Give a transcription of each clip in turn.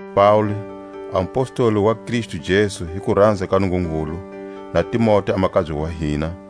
Paule, a mupostoli wa Kristu Jesu hi kuranza ka Nungungulu, na Timote a makabye wa hina,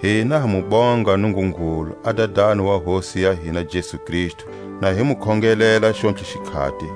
Hina ha mu bonga Nungungulu a Dadani wa Hosi ya hina Jesu Kristu na hi mu khongelela xontlhe xikhati,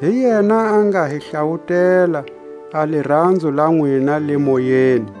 hi yena a nga hi hlawutela a liranzo la nwina le Moyeni.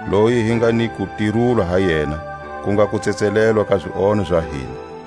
loyi hi nga ni kutirulwa ha yena, ku nga kutsetselelwa ka zionho za hina. Xifananiso xa Nungungulu a nga woniwiko.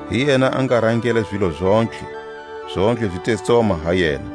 Hi yena a nga rangela zilo zontlhe, zontlhe zi te tsoma ha yena.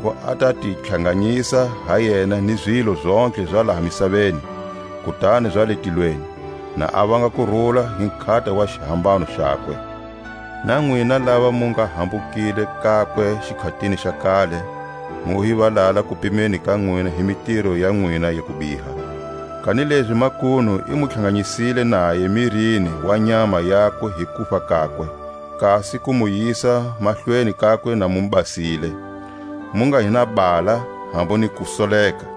lezaku a ta ti tlhanganisa ha yena ni zilo zontlhe za laha misaveni, kutani za le tilweni, na a vanga kurula hi nkhata wa xihambano xakwe. Na nwina lava mu nga hambukile kakwe xikhatini xa kale, mu hi valala kupimeni ka nwina hi mitiro ya nwina ya kubiha, kanilezi makunu i mu tlhanganyisile naye mirini wa nyama yakwe hi kufa kakwe, kasi ku mu yisa mahlweni kakwe na mu basile, mu nga hi na hala, hambu ni kusoleka,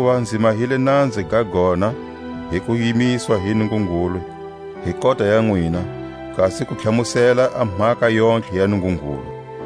Hakuva nzi mahile nanza ga gona, hi ku yimiswa hi Nungungulu hi kota ya nwina, kasi ku tlhamusela a mhaka yontlhe ya Nungungulu,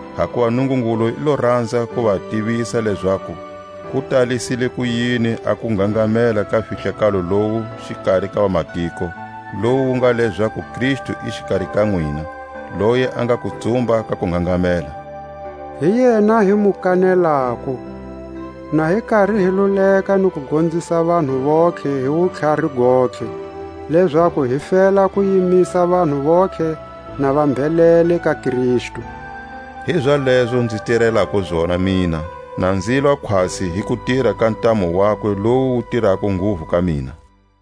Hakuva Nungungulu i lo ranza ku va tivisa lezaku ku talisile kuyini a kungangamela ka fihlakalo lowu xikari ka vamatiko, lowu wu nga lezaku Kristu i xikari ka nwina, loyi a nga kutsumba ka kungangamela. Hi yena hi mu kanelako, na hi kari hi luleka ni ku gonzisa vanhu vontlhe hi wutlhari gontlhe, lezaku hi fela ku yimisa vanhu vontlhe na va mbhelele ka Kristu. Hizalezo nzi tirelako zona mina, na nzilwa khwatsi hi kutira ka ntamu wakwe lowu wu tirako nguvu ka mina.